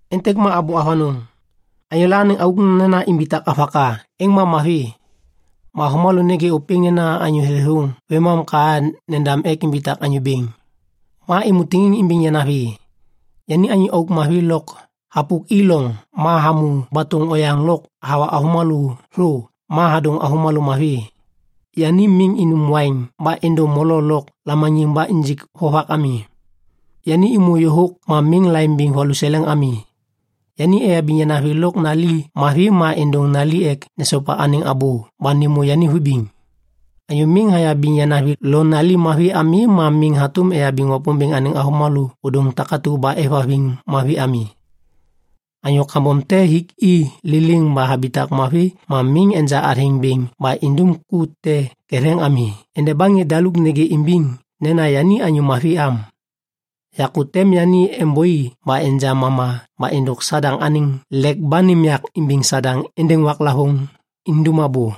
Êntêk ma abô avanôŋ. Anyôla anêŋ auk nena imbitak avaka, êŋ ma mavi. Ma avômalô nêgê ôpêŋ nena anyô thêthôŋ vêmam ka nendam ek imbitak anyô bêŋ. Ma êmô tiŋiŋ imbiŋ yanavi. Yani anyô auk mavi lôk hapuki loŋ ma hamô batôŋ oyaŋ lôk hawa avômalô thô ma hadôŋ avômalô mavi. Yani miŋ inum waiŋ ba endo molo lôk lamaniŋ ba injik vovak ami. Yani êmô yôhôk ma miŋ laimbiŋ valuseleŋ ami. Yani eyabiŋ yanavi lôk nali mavi ma êndôŋ nali ek nesopa anêŋ abô ba nêmô yani vibiŋ. Anyô miŋ hayabiŋ yanavi lo nali mavi ami ma miŋ hatôm eyabiŋ Wapômbêŋ anêŋ avômalô ôdôŋ takatu ba êvhaviŋ mavi ami. Anyô kambom te hiki liliŋ ba habitak mavi ma miŋ enja athêŋ bêŋ ba indum ku te ketheŋ ami endeba ŋê daluk nêgê imbiŋ nena yani anyô mavi am. Yakô tem yani êmbôi ba enja mama ba êndôk Sadaŋ anêŋ lek ba nêm yak imbiŋ Sadaŋ êndêŋ waklavôŋ indum abô.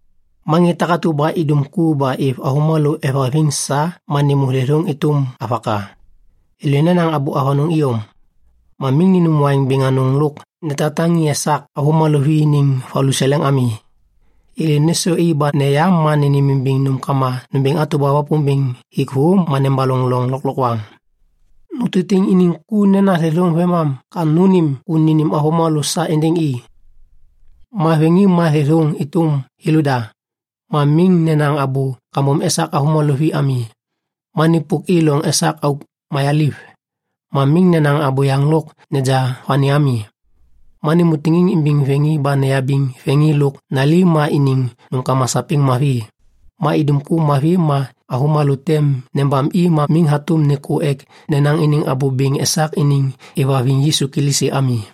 Ma ŋê takatu ba idum ku ba êv avômalô êvhaviŋ sa ma nêmô thêthôŋ êtôm avaka. Thêlô nenaŋ abô avanôŋ iyom. Ma miŋ ninum waiŋ bêŋ anôŋ lôk netaŋtaŋi esak avômalô vi iniŋ valuseleŋ ami. Thêlô nêsôi ba neya ma nênêmimbiŋ nômkama nômbêŋ atu ba Wapômbêŋ hik thô ma nebaloŋ loŋ lôklokwaŋ. Nutitiŋ iniŋ ku nena thêthôŋ vêmam ka nônêm ku nênêm avômalô sa êndêŋ i. Ma vêŋi ma thêthôŋ êtôm thêlôda. Ma miŋ nenaŋ abô kambom esak avômalô vi ami. Ma nipuki loŋ esak auk mayaliv. Ma miŋ nenaŋ abôyaŋ lôk neja vani ami. Ma nêmô tiŋiŋ imbiŋ vêŋi ba neyabiŋ vêŋi lôk nali ma iniŋ nômkama sapêŋ mavi. Ma idum ku mavi ma avômalô tem nebam i ma miŋ hatôm nêkô ek nenaŋ iniŋ abô bêŋ esak iniŋ hêvhaviŋ Yisu Kilisi ami.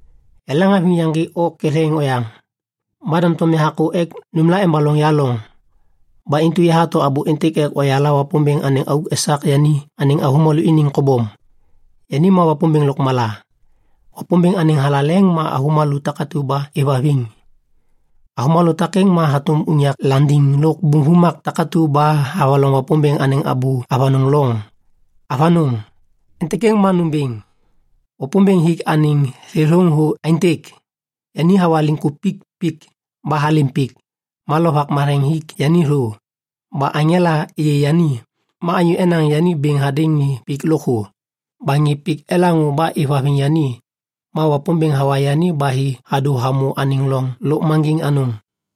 Yaleŋhaviŋ yaŋgê o ketheŋ oyaŋ. Ma doŋtom yahakô ek nômla embaloŋ ya loŋ. Ba intu yahato abô êntêk ek oyala Wapômbêŋ anêŋ auk esak yani anêŋ avômalô iniŋ kobom. Yani ma Wapômbêŋ lôkmala. Wapômbêŋ anêŋ thalaleŋ ma avômalô takatu ba êvhaviŋ. Avômalô takêŋ ma hatôm unyak landiŋ lôk bum vumak takatu ba havaloŋ Wapômbêŋ anêŋ abô avanôŋ loŋ. Avanôŋ! Êntêk êŋ ma nômbêŋ. Wapômbêŋ hik anêŋ thêthôŋ thô aêntêk. Yani hawa liŋkupik pik ba halêm pik, ma Lovak Matheŋ hik yani thô, ba aŋela êyê yani, ma anyô enaŋ yani bêŋ hadêŋ ŋê pik lôkthô, ba ŋê pik elaŋô ba êvhaviŋ yani, ma Wapômbêŋ hawa yani ba hi hadô hamô anêŋ loŋ lôkmaŋgiŋ anôŋ.